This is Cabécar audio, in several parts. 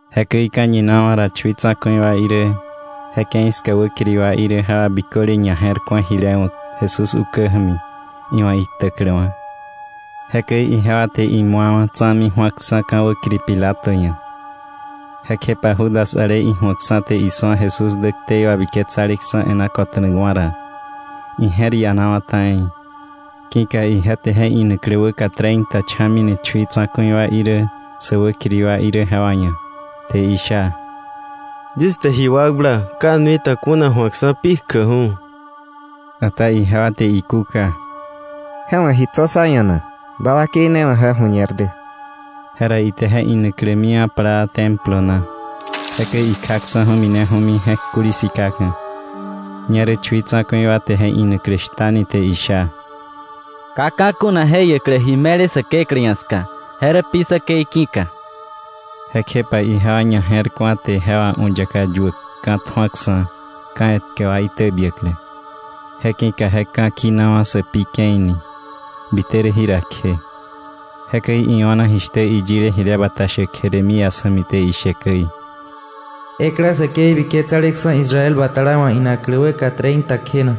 Jekäi ka̱ñinawa̱ ra, chui tsa̱ku̱i wa irä, je ke̱i ska wäkiri wa irä jewa biköle ñaje̱rku̱a jile wa̱k Jesús ukä ja̱mi iwa̱ iktäkläwa̱. Jekäi ijewa te imu̱awa̱ tsa̱mi ju̱aksa̱ ka̱ wäkiri Pilato ia̱. Jekjepa Judas ale iju̱akksa̱ te isu̱a Jesús dä ktei wabiketsaleksa̱ e̱ná ko̱ta̱nakwa̱ ra, ije̱r ianawa̱ ta̱i, ki̱ka ije te je inaklä wäka treinta cha̱mi ni chui tsa̱ku̱i wa irä sä wäkiri wa irä jewa ia̱, te isha: —Yis te ji wakbla, ka nuita kuna ju̱akksa̱ pi kjäkju̱. Ata ijewa te ikúka: —¿Je wa̱ ji tso̱ sá ia̱ na? Ba wakei ne wa̱ je ju̱ñer dä. Jera ite je inaklä miwa̱ plaa Templo na, jekäi ikjaksa̱ju̱ mineju̱mi, je̱k kuli sikaka̱. Ñerä chui tsa̱ku̱i wa te je inaklä shtani te isha: —Ka ka̱ kuna je jiäklä ji me̱le Säkeklä ia̱ ska, je rä pi säkei ki̱ka. Jekjepa ijewa ñaje̱rku̱a, te je wà u̱yaka yuäk ka̱ tju̱aksa̱, ka̱ etkä wa itäbiäklä. Je ki̱ka je ka̱ kinawa̱ Sä Pi Ke̱i ni, bite rä jira kje. Jekäi io̱na jishtä iyile jile bata shäk Jeremías ja̱mi te ishe käi: “Ekla säkei biketsaleksa̱ Israel batala wa̱ inaklä wäka treinta kjena,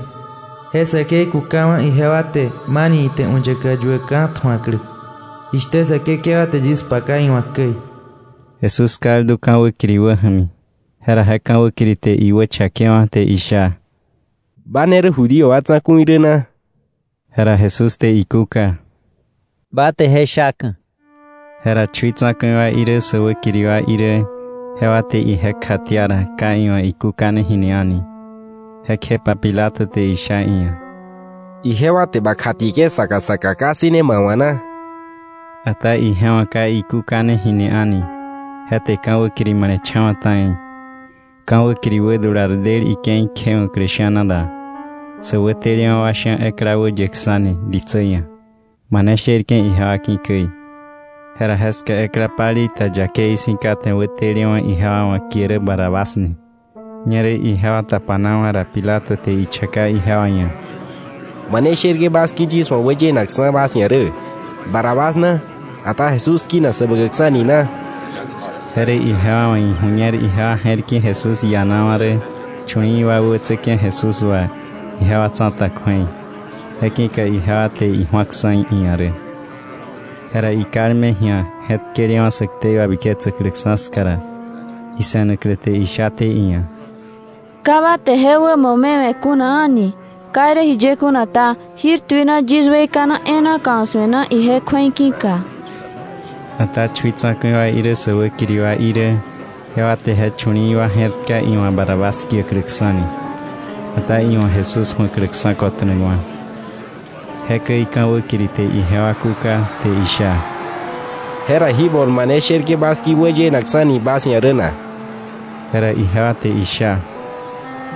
je säkei kukawa̱ ijewa te, mani ite u̱yaka yuäk ka̱ tju̱aklä, jishtä Säkekewa te yis paka iwa̱k käi.” Jesús kaldu ka̱ wäkiri wäja̱mi, jera je ka̱ wäkiri te iwächakewa̱ te isha: —¿Ba ne rä Judío wa Tsa̱ku̱i rä na? Jera Jesús te ikúka: —Ba te je shaka̱. Jera chui tsa̱ku̱i wa irä sä wäkiri wa irä, jewa te ije kjatia ra, ka iwa̱ ikúkane jini a̱ni. Jekjepa Pilato te isha iia̱: —¿Ijewa te ba kjatieke̱ saka saka, ka ssëne ma wa̱ na? Ata ije wa̱ ka ikúkane jini a̱ni, je te ka̱ wäkiri male̱cha̱wa̱ ta̱i. Ka̱ wäkiri wädular del ike̱i kjewa̱klä sha̱na ra, sä wätelewa̱ wa sha̱ ekla wäyäkksa̱ni ditsä ia̱, mane sherke̱ ijewa ki̱ käi. Jera jeska ekla palei ta yakei si̱ kate wätelewa̱ ijewa wa̱ kie rä Barrabás ni. Ñerä ijewa tapanawa̱ ra, Pilato te ichaka ijewa ia̱: —¿Mane sherke̱ bas ki̱ yis wa̱ wäyenakksa̱ bas ia̱ rä: Barrabás na, ata Jesús kinak Säbäkäkksa̱ ni na? Je rä ije wa̱ iju̱ñer ijewa je̱r ki̱ Jesús ianawa̱ rä chu̱li̱i̱ wa wäbätsäke̱ Jesús wà ijewa tsa̱ta kju̱ei, je ki̱ka ijewa te iju̱aksa̱ iia̱ rä. Jera ikalme ji̱a je̱tkelewa̱ sä ktei wabiketsäkläksa̱ ska ra, ise̱naklä te ishaté iia̱: “Ka ba te je wämo me we̱ kuna a̱ni. Ka irä jiye kuna ta, jir tuina yis weikana e̱e̱na kausu̱e na, ije kju̱ei ki̱ka.” Ata chui tsa̱ku̱i wa irä sä wäkiri wa irä, jewa te je chu̱li̱i̱ wa je̱rtka iwa̱ Barrabás kiäkläksa̱ni, ata iwa̱ Jesús ju̱akläksa̱ kota̱nakwa̱. Jekäi ka̱ wäkiri te ijewa kúka, te isha: —¿Jera ji bol mane sherke̱ bas ki̱ wäyenakksa̱ni bas ia̱ rä na? Jera ijewa te isha: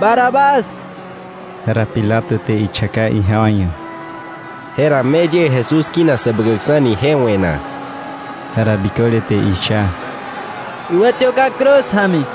—¡Barrabás! Jera Pilato te ichaka ijewa ia̱: —¿Jera me yie Jesús kinak Säbäkäkksa̱ ni je we̱ na? Jera biköle te isha: —¡Iwätiöka̱ cruz ja̱mi!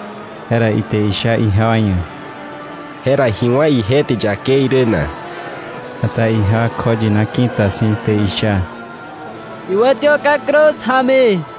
Jera ite isha ijewa ia̱: —¿Jera ji wá̱ ije te yakei rä na? Ata ijewa kjoyina ki̱ta si̱, te isha: —¡Iwätiöka̱ cruz ja̱mi!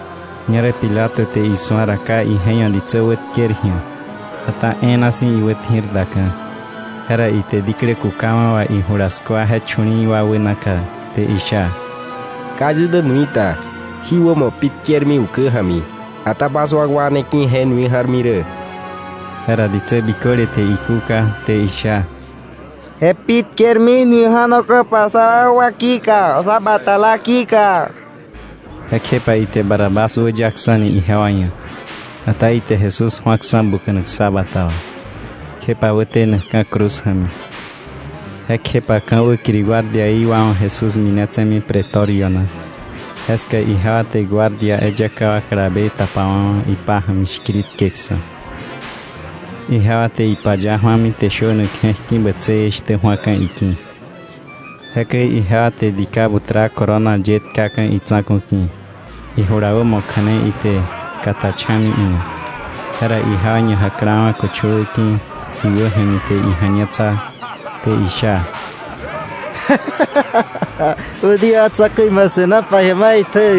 Ñerä Pilato te isu̱a ra ka ije ia̱ ditsä wätker ji̱a, ata e̱e̱na si̱ iwätji̱r daka̱, jera ite diklä kukawa̱ wà ijula skua je chu̱li̱i̱ wa wänaka, te isha: —Ka yis dä nuita, jí wämo pi tkermi ukä ja̱mi, ata bas wakwa ne ki̱ je nui ja̱rmi rä. Jera ditsä biköle te ikúka, te isha: —¡Je pi tkermi nui ja̱noka̱pa sa wakwa ki̱ka, sa batala ki̱ka! Jekjepa ite Barrabás wäyaksa̱ni ijewa ia̱. Ata ite Jesús ju̱aksa̱ buka̱nak ksa bata wà, kjepa wätenakka̱ cruz ja̱mi. Jekjepa ka̱ wäkiri guardiaí wa wa̱ Jesús minetse̱mi Pretorio na, jeska ijewa te guardia eyaka wa kalabe tapawa̱wa̱ ipája̱mi shkiritkeksa̱. Ijewa te ipaya ju̱ami, te shönak je̱k ki̱ bätsëë shtä ju̱aka̱ iki̱. Jekäi ijewa te dika butra corona ye tkaka̱ itsa̱ku̱ ki̱, ijula wämo kja̱ne ite kata cha̱mi iia̱. Jera ijewa ñajaklawa̱ köchöwä ki̱ iwä ja̱mi, te ija̱ñetsa, te isha: —¡Judío wa tsa̱ku̱i, ma se̱nopa ji̱a maitjä!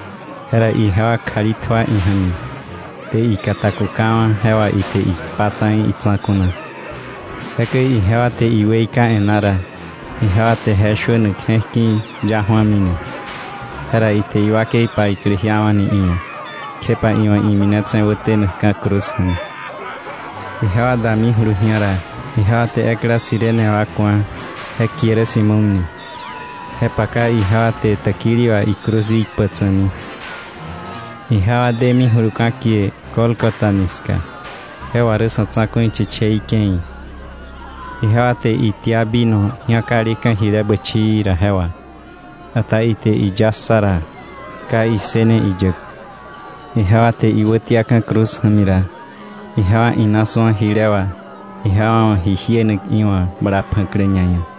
Jera ijewa kjali tjua ija̱mi, te ikata kukawa̱, je wà ite ikpa ta̱i itsa̱ku̱ na. Jekäi ijewa te iweika e̱ná ra, ijewa te je shönak je̱k ki̱ ya ju̱amini, jera ite iwakei paiklä jiawa̱ni iia̱, kjepa iwa̱ iminetse̱ wätenakka̱ cruz ja̱mi. Ijewa damijulu ji̱a ra, ijewa te ekla Cirene wa ku̱a, je kie rä Simón ni, je paka ijewa te täkili wà icruz í kpäk tsa̱mi. Ijewa demijulu ka̱ kie Gólgota ni ska, (je wà rä “Sa̱tsa̱ku̱ Chichei Ke̱i”), ijewa te itia vino ji̱akaleka̱ jile bächii ra je wà; ata ite iya ssa ra, ka issëne iyäk. Ijewa te iwätiaka̱ cruz ja̱mi ra, ijewa ina su̱a jile wà ijewa wa̱ ji jienak iwa̱ bala pja̱klä ñaia̱,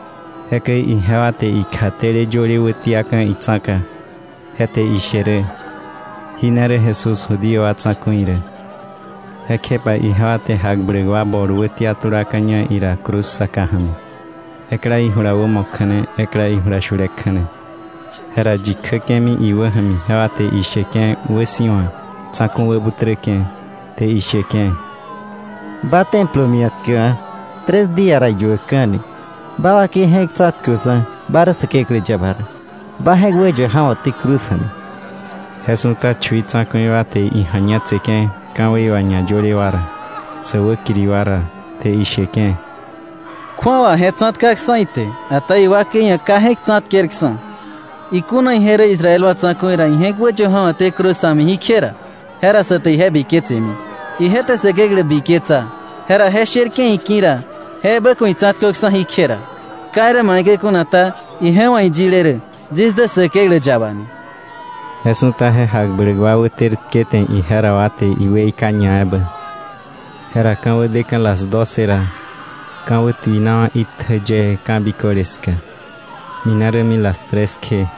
Jekäi ijewa te ikjatele yöle wätia tka itsa̱ka, je te ishe rä: “Jí ne rä Jesús, Judío wa Tsa̱ku̱i rä.” Jekjepa ijewa te jakbläk wa bol wätia tulaka̱ña ira cruz saka ja̱mi, ekla ijula wämo kja̱ne, ekla ijula shule kja̱ne. Jera yi kjäke̱mi iwä ja̱mi jewa te isheke̱ wäsi̱wa, tsa̱ku̱ wäbuträke̱, te isheke̱: —¡Ba, Templo mia̱tkäkwa̱, tres día ra iyuäkka̱ni, ba wakei je̱k tsa̱tköksa̱ ba rä Säkeklä yaba ra, ba je̱k wäyö ja̱wo̱té cruz ja̱mi! Je su̱ta chui tsa̱ku̱i wa te ija̱ñetseke̱ ka̱wei wà ñayöle wa ra, sä wäkiri wa ra, te isheke̱: —Kju̱awa je tsa̱tkaksa̱ ite, ata iwakei ia̱ ka je̱k tsa̱tkerksa̱. ¡Ikuna ije rä Israel wa tsa̱ku̱i ra, ije̱k wäyö ja̱wo̱té cruz ja̱mi jí kje ra! Je ra sä te ije biketsemi. Ije je̱r bla Säkeklä ja̱mi; jera ije sherke̱ iki̱ ra, je ebä ku̱ itsa̱tköksa̱ jí kje ra. Ka irä maikäi kuna ta, ije wa̱ iyile rä, yis dä Säkeklä yaba ni. Je su̱ta je jakbläk wa wäter tkete ije ra wa te iweika ñaebä. Jera ka̱wä deka̱ las doce ra, ka̱ wätuinawa̱ itjä yee ka̱ biköle ska, mine rämi las tres kje.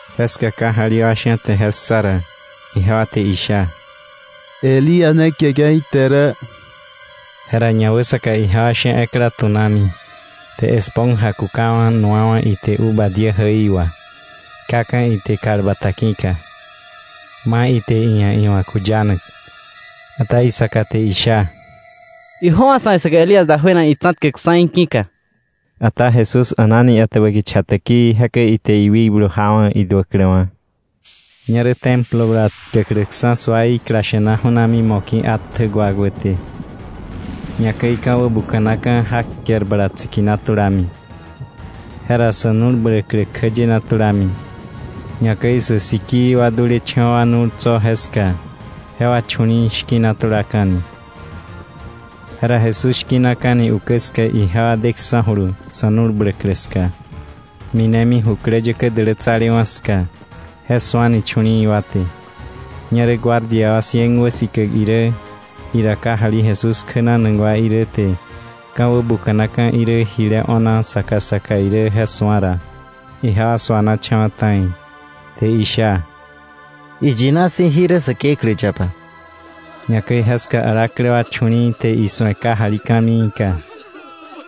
Jeska kajali wa sha̱ te je ssa ra, jewa te isha: —Elías ne kieke̱ ite rä. Jera ñawäsaka ijewa sha̱ ekla tu̱nami, te esponja kukawa̱, nu̱wa̱ ite uva diä jäi wa, tkaka̱ ite kal bata ki̱ka, ma̱ ite iia̱ iwa̱ kuyanak. Ata isaka te isha: —Ijöwa̱ sa̱ wa̱ isu̱aklä Elías dajuena itsa̱tkäkksa̱ í̱ ki̱ka. Ata Jesús a̱nani etäbä kicha täkii, jekäi ite iwikblu cha̱mita̱na. Ñerä Templo bala tkäkläksa̱ suaí klasha̱na ju̱nami mo̱ki̱ atjä wakwäté. Ñakäi ka̱ wäbuka̱naka̱, jak ker bala tsikina tulami. Jera sä nu̱l bläklä kjäyena tulami, ñakäi sä sikii wa dulecha̱wa̱ nu̱l tso̱ jeska, jewa chu̱li̱i̱ shki̱na tulaka̱ni. Jera Jesús shki̱naka̱ni ukä ska, ijewa deksa̱julu sa̱ nu̱l bläklä ska, minemi jukläyäkä dälätsalewa̱ ska, je su̱ani chu̱li̱i̱ wa te. Ñerä guardia wa cien wäsikäk irä, ira kajali Jesús kjänanak wa irä te ka̱ wäbuka̱naka̱ irä jile o̱na saka saka irä je su̱a ra, ijewa suanacha̱wa̱ ta̱i, te isha: —¡Iyina si̱ jí rä Säkeklä yaba! Ñakäi jeska alaklä wa chu̱li̱i̱ te isu̱e kajali ka̱miika.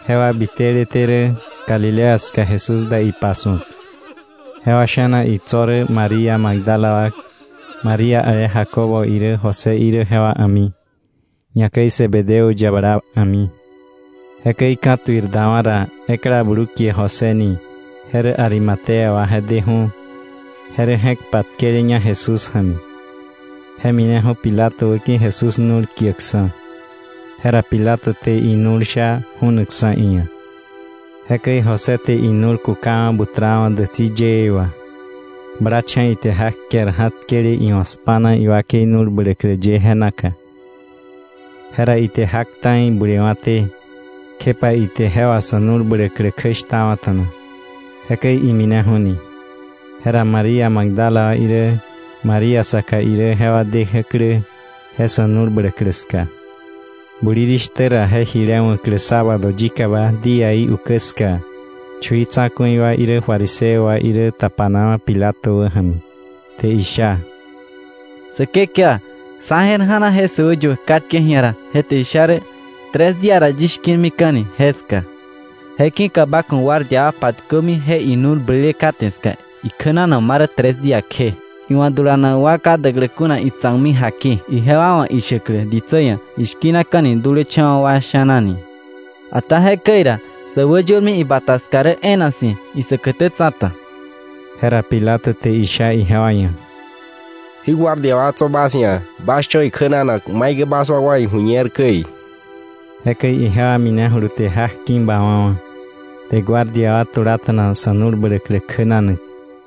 Jewa biteleté rä Galilea ska Jesús da ipasu̱ak. Jewa sha̱na itso̱ rä María Magdala wa, María ale Jacobo irä José irä jewa a̱mi, ñakäi Zebedeo yabala a̱mi. Jekäi ka̱tuir dawa̱ ra, ekla blu kie José ni je rä Arimatea wa je deju̱, je rä je̱k patkeleña Jesús ja̱mi, je mineju̱ Pilato wäki̱ Jesús nu̱l kiäkksa̱, jera Pilato te inu̱l sha ju̱nakksa̱ iia̱. Jekäi José te inu̱l kukawa̱ butrawa̱ dätsi yëë wa, blacha̱ ite jak ker ja̱tkele iwa̱ spa̱na iwakei nu̱l bläklä ye je naka. Jera ite jak ta̱i bulewa̱té, kjepa ite je wà sa̱ nu̱l bläklä kjäshtawa̱ta̱na, jekäi imineju̱ni. Jera María Magdala wa irä, María saka irä jewa dejäklä je sa̱ nu̱l bläklä ska. Bulirishtä ra, je jile wa̱klä sábado yikaba díaí ukä ska, chui tsa̱ku̱i wa irä fariseo wa irä tapanawa̱ Pilato wäja̱mi, te isha: —Säkekewa, sá je̱r ja̱na, je säwäyuäk katke ji̱a ra, je te isha rä: “Tres día ra yis shki̱rmika̱ni” jeska. Je ki̱ka ba ku̱ guardia wa patkömi je inu̱l blele kate ska ikjänanak ma rä tres día kje, iwa̱ dulanak wa ka däklä kuna itsa̱kmi jaki, ijewa wa̱ ishäklä ditsä ia̱ ishkinakani dulecha̱wa̱ wa sha̱na ni. Ata jekäi ra, sä wäyormi ibata ska rä e̱e̱na si̱ isäkätä tsa̱ta. Jera Pilato te isha ijewa ia̱: —Jí guardia wa tso̱ bas ia̱; bas cho̱ ikjänanak maikäi bas wa̱ iju̱ñer käi. Jekäi ijewa minejulu te jak ki̱ bawa̱wa̱, te guardia wa tulata̱na sa̱ nu̱l bläklä kjänanak.